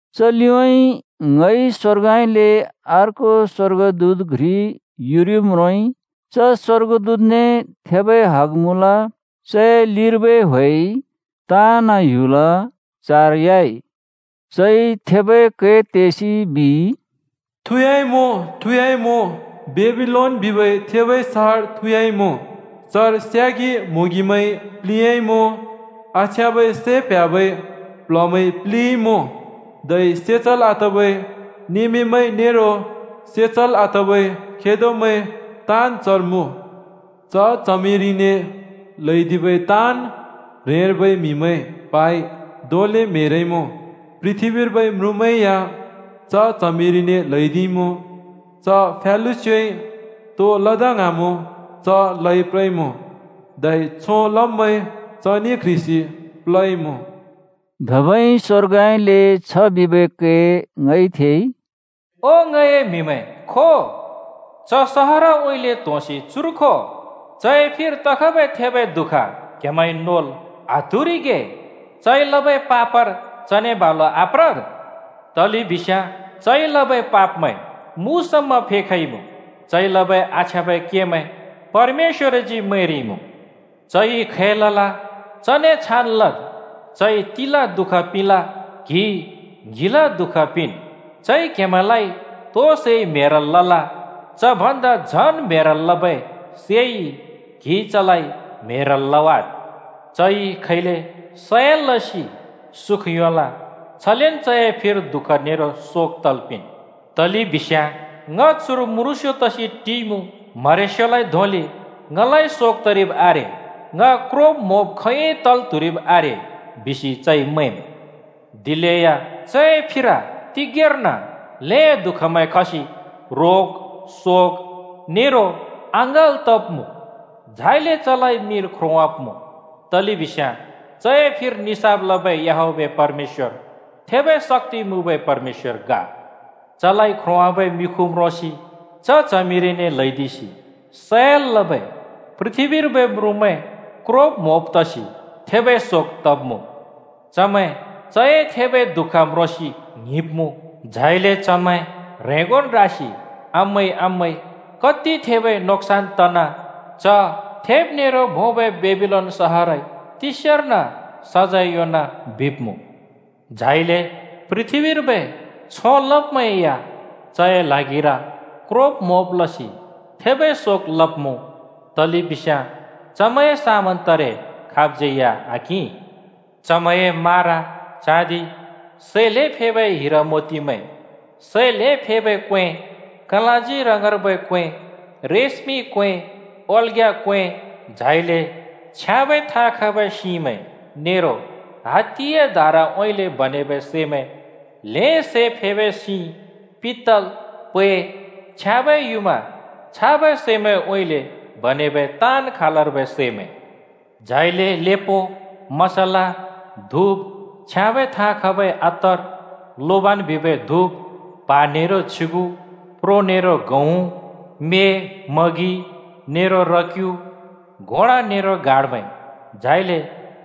च लिउँइँ ङइ स्‍वर्गउँइँले अर्को स्‍वर्गदूत घ्रि युरिब् म्रोंइ। च स्‍वर्गदूतने थेबै हग मुँल, चए लिर्बै ह्‍वेइ ताँन् ह्‍युल चारयाइ। चइ थेबै कै तेसि बिइ, “थुँयाइमुँ! थुँयाइमुँ! बेबिलोन बिबै थेबै सहर थुँयाइमुँ! चर स्यागि म्होंगिमैंइ प्लिंयाइमुँ, आछ्याँबै सैं प्ह्‍याबै प्ल्हमैंइ प्लिंइमुँ, धै से चल् आतबै नमेमैं नेरो से चल् आतबै खेदोमैं ताँन् चर मुँ। च च्हमिरिने ल्हैदिबै ताँन् ह्रेंर्बै म्‍हिमैं प्हाइ धोंले म्हेरइमुँ। पृथ्‍बीर्बै म्रुँमैं या च च्हमिरिने ल्हैदिइमुँ। च फ्यालुस्योइ तो लदा ङ्हाँमुँ चन् लप्रइमुँ, धै छों लब्मैं चने क्ह्रिसि प्लइमुँ।” धबै स्‍वर्गउँइँले छ बिबै कै ङइ थेइ, “ओ ङए म्‍हिमैं, खो! च सहरउँइँले त्‍होंसि चुर खो। चए फिर तखबै थेबै दुःख क्‍हेमैंइ नोल् आत्‍हुरिगे चइ लबै पापर चने बालु आप्रद्। तलेबिस्याँ चइ लबै पापमैं मु समा फेखइमुँ, चइ लबै आछ्याँबै केमैं परमेश्‍वरजी मैंरिइमुँ। चइ खै लल चने छान् लद्, चइ तिल दुःख पिंल, क्हिइ ङ्हिल दु:ख पिंन्। चइ क्हेमैंलाइ तो सैइ म्हेरल् लल च भन्दा झन् म्हेरल् लबै सैइ क्हिइ चलाइ म्हेरल् लवाद्। चइ खैले सयल लसि सुख योंल, छलेन् चए फिर दुःख नेरो शोक तल् पिंन्। तलेबिस्याँ ‘ङ चुर म्रुँस्‍यो तसि टिइमुँ। म्हरेस्योलाइ धोंले ङलाइ शोक तरिब् आरे, ङ क्रोब-म्‍होब खोंयोंइ लल् त्हुरिब् आरे!’ बिसि चइ मैंम्। दिलेया चए फिर तिगेंर्न ल्हें दु:खमैं खसि, रोग, शोक नेरो अँङ्गल् तब्‍मुँ। झाइले चलाइ मिर ख्रोंवाब्‍मुँ, तलेबिस्याँ चए निसाफ लबै याहवेह परमेश्‍वर थेबै शक्‍ति मुँबै परमेश्‍वर ग। “चलाइ ख्रोंवाबै मिखु म्रोंसि च च्हमिरिने ल्हैदिसि सयल लबै पृथ्‍बीर्बै म्रुँमैं क्रोब-म्‍होब तसि थेबै शोक तब्‍मुँ। चमैं चए थेबै दुःख म्रोंसि ङ्हिंब्मुँ। झाइले चमैं ह्रेंगोन् रासि ‘आमै! आमै! कति थेबै नोक्‍सान तना! च थेब नेरो भोंबै बेबिलोन सहरइ तिस्यार्न सजैं योंना,’ बिब्मुँ। “झाइले पृथ्‍बीर्बै छों लब्मैं या चए ल्हागिर क्रोब-म्‍होब लसि थेबै शोक लब्‍मुँ, तलेबिस्याँ चमैंए समान तारे खाबज्‍यै या आकिं। चमैंए मारा, चाँदि, सै ल्हें फेबै हिरामोतिमैं, सै ल्हें फेबै क्‍वें, कलाँजी रङर्बै क्‍वें, रेशमि क्‍वें, ओल्‍ग्‍या क्‍वें; झाइले छ्याँबै थाँ खबै सिंमैं नेरो हात्तिए दाराउँइँले बनेबै सैमैं, सै ल्हें फेबै सिं, पित्तल, पै, छ्याँबै युँमा छाबै सैमैंउँइँले बनेबै ताँन् खालर्बै सैमैं; झाइले लेपो, मसल, धुप, छ्याँबै थाँ खबै अत्तर, लोबान बिबै धुप, प्हा नेरो छ्युगु, प्रो नेरो गहुँ, म्‍ये, मगि नेरो र-क्यु, घोडा नेरो गाडामैं, झाइले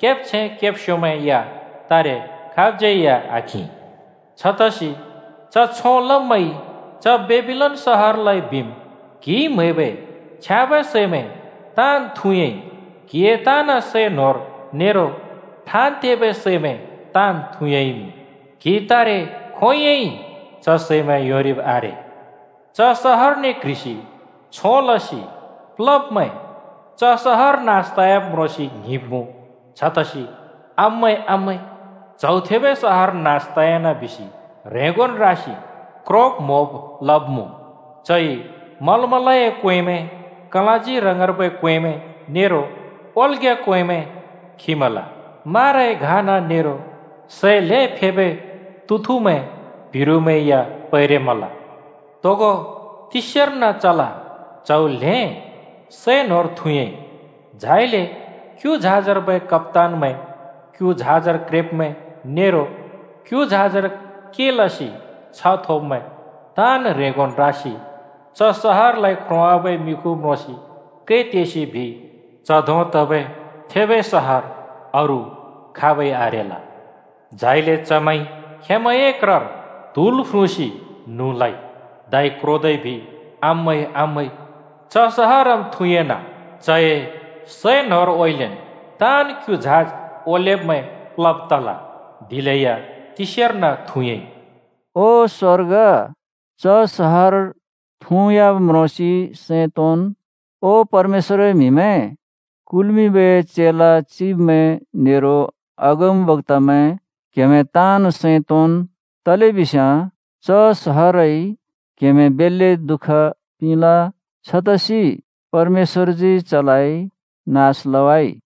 केब्छैं-केब्स्योमैं या तारे खाबज्यै आकिं। छतसि च छों लब्मैंइ च बेबिलोन सहरलाइ बिम्, ‘क्‍हिइ म्हैबै छ्याँबै सैमैं ताँन् थुँयाइ। क्‍हिए ताँन् सै न्होर नेरो ठाँन् तेबै सैमैं ताँन् थुँयाइमुँ। क्‍हिइ तारे खोंयोंइ च सैमैं योंरिब् आरे!’ च सहरने क्ह्रिसि छों लसि प्लब्मैं च सहर नास तयाब् म्रोंसि ङ्हिंब्मुँ। छतसि ‘आमै! आमै! च्‍हौ थेबै सहर नास तयान बिसि ह्रेंगोन् रासि क्रोब-म्‍होब लब्‍मुँ। चइ मलमलए क्‍वेंमैं, कलाँजी रङर्बै क्‍वेंमैं, नेरो ओल्‍ग्‍या क्‍वेंमैं खिमल माराए घाना नेरो सै ल्हें फेबै तुथुमैं प्हिरुमैं या पैरेमल। तोगो तिस्यार्न चल च्‍हौ ल्हें सै न्होर थुँयाइ।’ “झाइले क्‍यु झाजर्बै कप्‍तानमैं, क्यु झाजर क्रेब्‍मैं नेरो क्यु झाजर के लसि छ्ह थोब्‍मैं ताँन् ह्रेंगोन् रासि च सहरलाइ ख्रोंवाबै मिखु म्रोंसि कै तेसि बिइ, ‘च धों तबै थेबै सहर अरू खाबै आरेल!’ झाइले चमैंइ खेंमैंए क्रर त्‍हुल फ्रुँसि न्हुँ लइ। धै क्रोदै बिइ, ‘आमै! आमै! च सहरम् थुँयाना! चए सैंन्होरउँइँलेन् ताँन् क्यु झाज ओलेब्मैं प्लब् तल, दिलेया तिस्यार्न थुँयाइ।’” (ओ स्वर्ग, च सहर थुँयाब् म्रोंसि सैं तोंन्! ओ परमेश्‍वरए म्‍हिमैं, कुल्मिंबै चेला चिब्मैं नेरो अगमबक्‍तामैं क्हेमैं ताँन् सैं तोंन्। तलेबिस्याँ च सहरइ क्‍हेमैं बेल्‍ले दुःख पिंल, छतसि परमेश्‍वरजी चलाइ नास लवाइ।)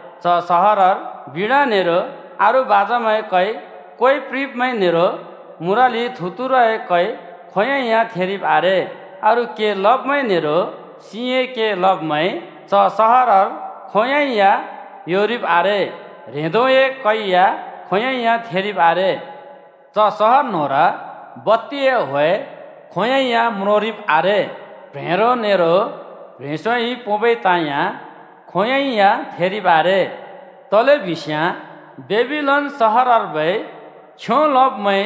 च सहरर बीणा नेरो अरू बाजामैंए कै, क्‍वे प्रिंब्‍मैं नेरो मुरलि थुतुरुए कै खोंयोंइ या थेरिब् आरे। अरू के लब्मैं नेरो सिंए के लब्मैं च सहरर खोंयोंइ या योंरिब् आरे, ह्रेंदोए कै या खोंयोंइ या थेरिब् आरे। च सहर न्‍होंर बत्तिए ह्‍वे खोंयोंइ या म्रोंरिब् आरे, प्ह्रेंरो नेरो प्‍ह्रेंस्‍योइ पोंबै ताँ या खोंयोंइ या थेरिब् आरे। तलेबिस्याँ बेबिलोन सहरर्बै छों लब्मैं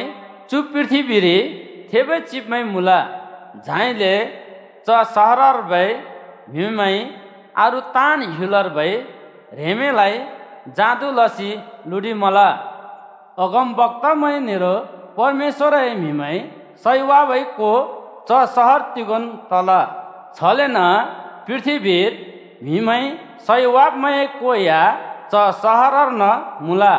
चु पृथ्‍बीरि थेबै चिब्‍मैं मुँल, झाइले च सहरर्बै म्‍हिमैंइ अरू ताँन् ह्‍युलर्बै ह्रेंमैंलाइ जादु लसि लुडिमल। अगमबक्‍तामैं नेरो परमेश्‍वरए म्‍हिमैं सैवाबै को च सहर तिगोंन् तल, छलेन पृथ्‍बीर म्हिमैंइ सैवाब्मैंए को या च सहरर्न मुँल।”